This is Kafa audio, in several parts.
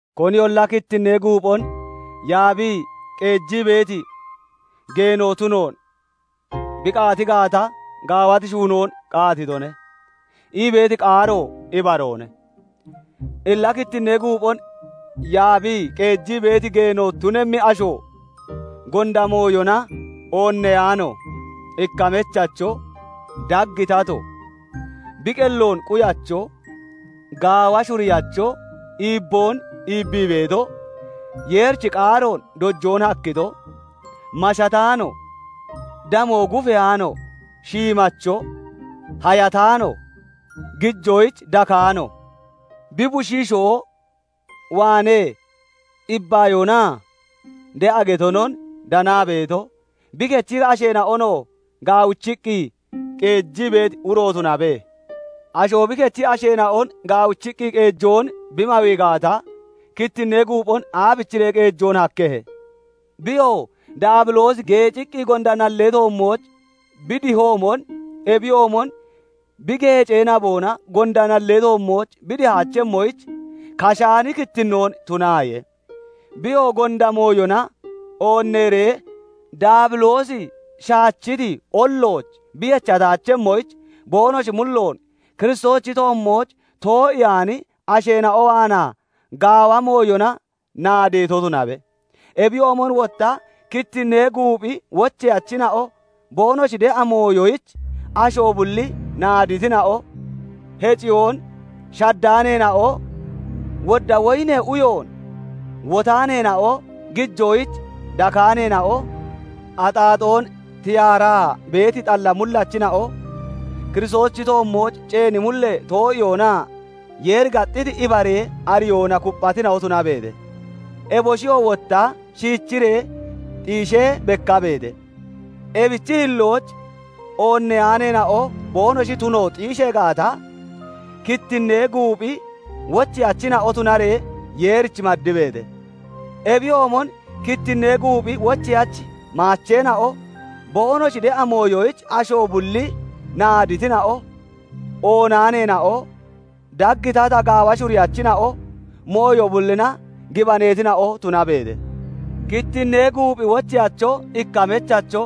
"Koniyolla kittinnee guuphon yaabii qeejii beeti geeno tunoon bi qaati gaata, gaawati shuunoon qaatitone" ii beeti qaaro ibaroone. Illa kittinnee guuphon yaabii qeejii beeti geeno tunemmi asho, gonda mooyona oonneyaano, ikka mechacho, dag tato, bi qelloon quyacho, gaawa shuriyacho, iibboon iibbii beeto, Yeerichi qaaroon dojoon hakkito, mashataano, damo gufeyaano, shiimacho, hayataano (nabataano), gijoyich dakaano, bi bushiishoo waanee ibbayoonaa de'a getonon danaa beeto, bi kechi asheena'onoo gaawichiqqi qeejii beeti uro tunabe. Asho bi kechi asheena'on gaawichiqqi qeejoon bi mawii gaata, kittinnee guuphon aabichiree qeejoon hakkehe? Biyo, Daabiloosi geeciqqi gonda nallee toommooch bi dihoomon, ebiyoomon bi geecee naboona gonda nallee toommooch bi dihaachemmoyich, kashaani kittinnoo tunaaye. Wotta gonda mooyona oonneeree Daabiloosi shaachiti ollooch bi yechataachemmoyich, boonoshi mulloon Kiristoosichi toommooch too'iyaani asheena'o waanaa gaawa mooyona naadeeto tunabe. Ebiyoomon wotta kittinnee guuphi wocheyachina'o boonoshi de'a mooyoyich asho bulli naaditina'o, heciyoon shaddaaneena'o, wodda woyinee uyoon wotaaneena'o, gijoyich dakaaneena'o, axaaxoon tiyaaraa beeti xalla mullachina'o, Kiristoosichi toommooch ceeni mullee too'iyoonaa Yeeri gaxxiti ibaree ariyoona kupphatina'o tunabeete. Eboshiyoo wotta shiichiree xiishee bekkabeete; ebichi hillooch oonneyaaneena'o boonoshi tuno xiishee gaata, kittinnee guuphi wocheyachina'o tunaree Yeerich maddibeete. Ebiyoomon kittinnee guuphi wocheyachi maacheena'o boonoshi de'a mooyoyich asho bulli naaditina'o, oonaaneena'o, dag tata gaawa shuriyachina'o, mooyo bullina gibaneetina'o tunabeete. Kittinnee guuphi wocheyacho ikka mechacho,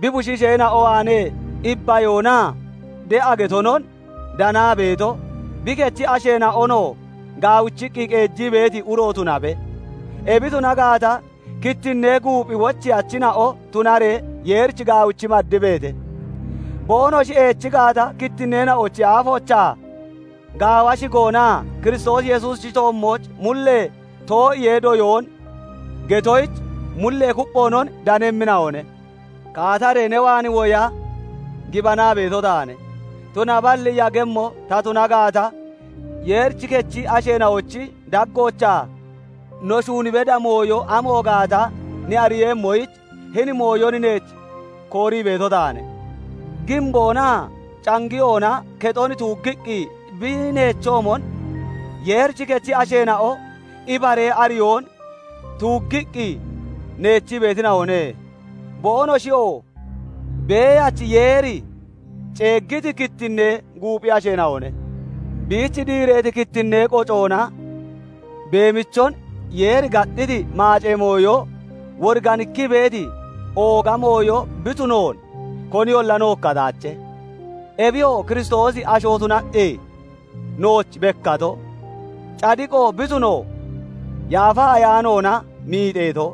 bi bushiisheena'o waanee ibbayoonaa de'a getonon danaa beeto, bi kechi asheena'onoo gaawichiqqi qeejii beeti uro tunabe. Ebi tuna gaata, kittinnee guuphi wocheyachina'o tunaree Yeerich gaawichi maddibeete. Boonoshi eechi gaata, kittinneena'ochi aafoochaa gaawa shigoonaa Kiristoos Yesuusichi toommooch mullee too'iyee doyoon getoyich mullee kupphoonon danemmina'one. Kaataree ne waan woya gibanaa beeto taane; tunaballi yagemmo ta tuna gaata, Yeerichi kechi asheena'ochi daggoochaa no shuun beda mooyo amo gaata ne ariiyemmoyich, hini mooyon neech koorii beeto taane. Giimboonaa cangiyoona kexon tuuggiqqi bi neechoomon, Yeerichi kechi asheena'o ibaree ariyoon tuuggiqqi neechii beetina'one; boonoshiyoo Beeyachi Yeeri ceeggiti kittinnee guuphi asheena'one. Biich diireeti kittinnee qocoona beemichon Yeeri gaxxiti maacee mooyo woriganikkii beeti ooga mooyo bi tunoon koniyolla nookkataache; ebiyo Kiristoosi asho tunaqqi nooch bekkato, cadiqo bi tuno Yaafa Ayaanoona miixeeto,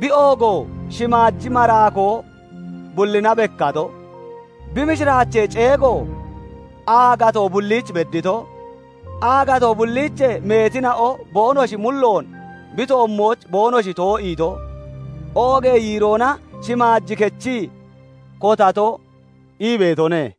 bi oogo shimaaji maraakoo bullina bekkato, bi mishiraachee ceego aagatoo bulliich beddito, aagatoo bulliichee meetina'o boonoshi mulloon bi toommooch boonoshi too'iito, oogee yiiroona shimaaj kechii kotato ii beetone.